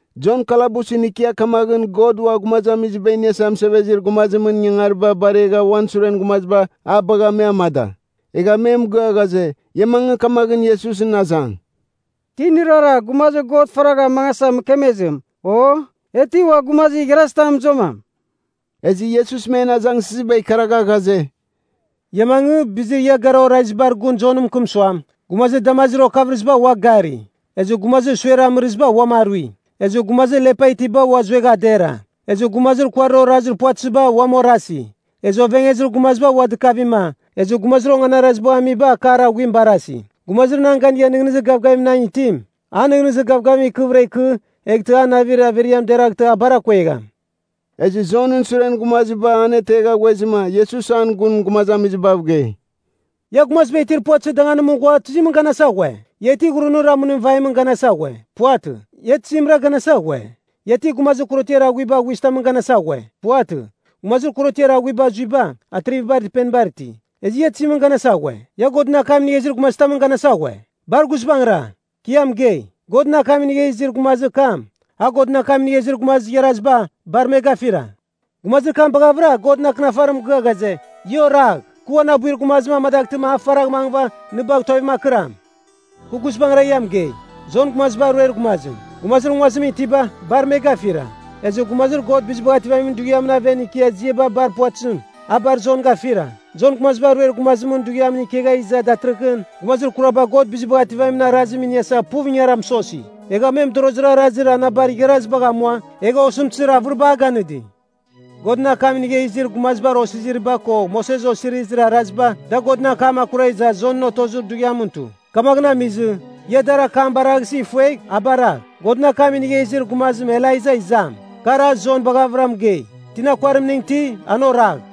Jon kalabusɨn ikia kamaghɨn God Ua Gumazamiziba Iniasa Mɨsevezir Gumazimɨn ingangariba baregha uan suren gumaziba a bagha me amada. Egha me mɨgɨa ghaze, ia mangɨ kamaghɨn Iesusɨn azang, “Ti nɨrara, gumazir God faragha amangasa mɨkemezim? O, e ti ua gumazir igharazitam mɨzuamam?” Ezɨ Iesus men azangsɨziba ikaragha ghaze, “Ia mangɨ, bizir ia garava orazibar gun Jon mɨkɨm suam, ‘Gumazir damazir okavɨrɨziba ua gari, ezɨ gumazir suer amɨrɨziba uam arui. Ezɨ gumazir lepa itiba ua zuegha dera, ezɨ gumazir kuarir orazir puvatɨziba uam orasi. Ezɨ ovengezir gumaziba ua dɨkavima, ezɨ gumazir onganarazibagh amiba akar aghuim barasi.’ Gumazir nan ganigha nɨghnɨzir gavgavim nan itim, an nɨghnɨzir gavgavim ikɨvɨra ikɨ, eghtɨ an navir averiam deraghtɨ a bar akuegham!” Ezɨ Jonɨn suren gumaziba an ategha ghuezɨma, Iesus an gun gumazamizibav gei, “Ia gumaziba itir puvatɨzir danganimɨn ghua tizimɨn ganasa ghue? Ia ti ghurunir amɨnim vaimɨn ganasa ghue? Puvatɨ. Ia tizimra ganasa ghue? Ia ti gumazir korotiar aghuiba aghuizɨtamɨn ganasa ghue? Puvatɨ. Gumazir korotiar aghuiba azuiba, atrivibar dɨpenibar iti. Ezɨ ia tizimɨn ganasa ghue? Ia Godɨn akam inigha izir gumazitamɨn ganasa ghue? Bar guizbangɨra! Ki ia mɨgei, Godɨn akam inigha izir gumazir kam, a Godɨn akam inigha izir gumazir igharaziba, bar me gafira. Gumazir kam baghavɨra Godɨn Akɨnafarim mɨgɨa ghaze, ‘Ia oragh. Kɨ uan abuir gumazim amadaghtɨma, a faragh mangɨva nɨ bagh tuavim akɨram.’ Kɨ guizbangɨra ia mɨgei, Jon Gumazibar Ruer Gumazim, gumazir nguazimɨn itiba, bar me gafira. Ezɨ gumazir God Bizibagh Ativamin Dughiamɨn aven ikia ziaba bar puvatɨzim, a bar Jon gafira. “Jon Gumaziba Ruer Gumazimɨn dughiamɨn ikegha iza datɨrɨghɨn, gumazir kuraba God Bizibagh Ativamin Arazim iniasa puv ingara mɨsosi. Egha me mɨdorozir arazir anabar igharazibagh amua, egha osɨmtɨzir avɨriba a ganɨdi. Godɨn akam inigha izir gumazibar osiziriba ko Moses Osirizir Araziba, da Godɨn akam akura iza Jon otozir dughiamɨn tu. Kamaghɨn amizɨ, ia dar akam baraghsɨ ifuegh, a baragh, ‘Godɨn akam inigha izir gumazim Elaiza izam,’ kar a Jon baghavɨra mɨgei. Tina kuarimning iti, an oragh.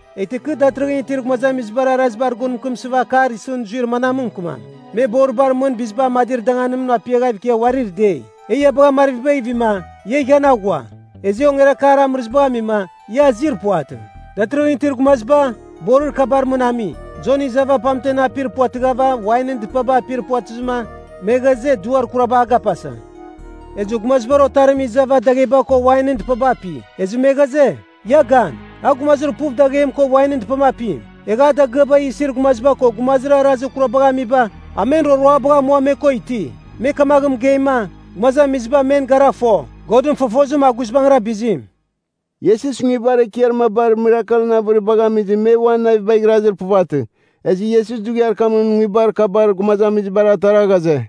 “Eghtɨ kɨ datɨrɨghɨn itir gumazamizibar arazibar gun mɨkɨmsɨva akar isɨn zuir manam mɨkɨmam? Me boribar mɨn biziba amadir danganimɨn apiaghav ikia uarir dei, ‘E ia bagha marvibagh ivima, ia ighian aghua. Ezɨ e ongerakar amɨrɨzibagh amima, ia azir puvatɨ.’ Datɨrɨghɨn itir gumaziba, borir kabar mɨn ami. Jon izava pamten apir puvatɨghava wainɨn dɨpaba apir puvatɨzɨma, me ghaze, ‘Duar kuraba a gapasa.’ Ezɨ Gumazibar Otarim izava dagheba ko wainɨn dɨpaba api. Ezɨ me ghaze, ‘Ia gan, a gumazir puv daghem ko wainɨn dɨpam apim. Egha a dagɨaba isir gumaziba ko gumazir arazir kurabagh amiba, a men roroabagh amua me ko iti.’ Me kamaghɨn mɨgeima, gumazamiziba men gara fo, Godɨn fofozim a guizbangɨra bizim.” Iesus nguibar ekiar mabar mirakelɨn avɨribagh amizɨ me uan navibagh irazir puvatɨ. Ezɨ Iesus dughiar kamɨn nguibar kabar gumazamizibar atara ghaze,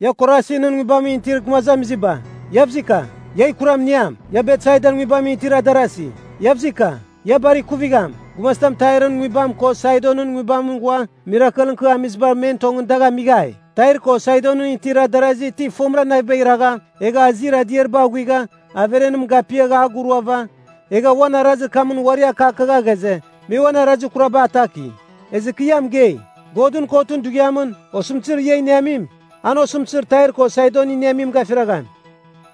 “Ia Korasinɨn nguibamɨn itir gumazamiziba, Iavzika! Ia kuram iniam. Ia Betsaidan nguibamɨn itir adarazi, Iavzika! Ia bar ikuvigham. Gumazitam Tairɨn nguibam ko Saidonɨn nguibamɨn ghua, mirakelɨn kɨ amiziba men tongɨn dagh amighai, Tair ko Saidonɨn itir darazi ti fomɨra navibagh iragha, egha azir adiariba aghuigha, averenim gapiava aguruava, egha uan arazir kamɨn uari akakagha ghaze, me uan arazir kuraba ataki. Ezɨ kɨ ia mɨgei, Godɨn Kotɨn Dughiamɨn, osɨmtɨzir ia iniamim, an osɨmtɨzir Tair ko Saidon iniamim gafiragham.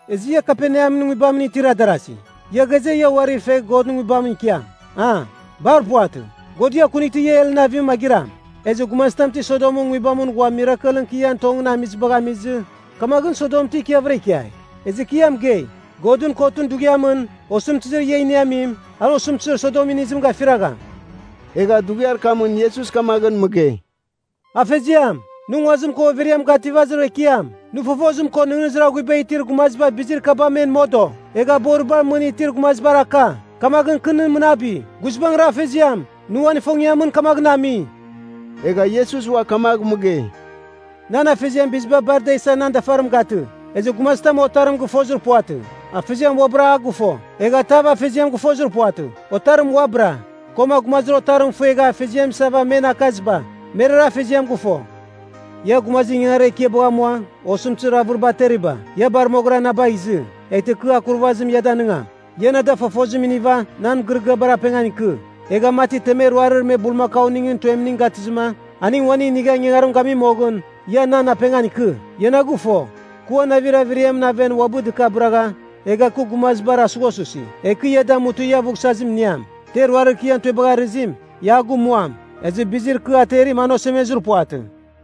Ezɨ ia Kaperneamɨn nguibamɨn itir darazi, ia ghaze, ia uari fegh Godɨn Nguibamɨn ikiam, a? Bar puvatɨ, God ia akunightɨ ia Helɨn avim magɨram. Ezɨ gumazitam ti Sodomɨn nguibamɨn ghua mirakelɨn kɨ ian tongɨn amizibagh amizɨ, kamaghɨn Sodom ti ikiavɨra ikiai. Ezɨ kɨ ia mɨgei, Godɨn Kotɨn Dughiamɨn, osɨmtɨzir ia iniamim, an osɨmtɨzir Sodom inizim gafiragham.” Egha dughiar kamɨn Iesus kamaghɨn mɨgei, “Afeziam, nɨ nguazim ko overiam gativazir Ekiam! Nɨ fofozim ko nɨghnɨzir aghuiba itir gumaziba bizir kaba men modo, egha boribar mɨn itir gumazibar aka. Kamaghɨn kɨ nɨ mɨnabi. Guizbangɨra Afeziam, nɨ uan ifongiamɨn kamaghɨn ami.” Egha Iesus ua kamagh mɨgei, “Nan Afeziam biziba bar ada isa nan dafarim gatɨ. Ezɨ gumazitam Otarim gɨfozir puvatɨ. Afeziam uabɨra a gɨfo. Egha tav Afeziam gɨfozir puvatɨ. Otarim uabɨra, koma gumazir Otarim ifuegha Afeziam isava men akaziba, merara Afeziam gɨfo. Ia, gumazir ingangarir ekiabagh amua osɨmtɨzir avɨriba ateriba, ia bar moghɨra na bagh izɨ. Eghtɨ kɨ aghuvsazim ia danɨngam. Ia na da fofozim iniva nan mɨgɨrɨgɨabar apengan ikɨ, egha mati temer ruarir me bulmakauningɨn tuemning gatɨzɨma aning uaning inigha ingangarim gami moghɨn, ia nan apengan ikɨ. Ia na gɨfo, kɨ uan navir averiamɨn aven uabɨ dɨkabɨragha, egha kɨ gumazibar asughasusi. Egh kɨ ia damutɨ ia aghuvsazim iniam. Ter ruarir kɨ ian tuebagh arɨzim, ia a gumuam, ezɨ bizir kɨ aterim an osemezir puvatɨ.”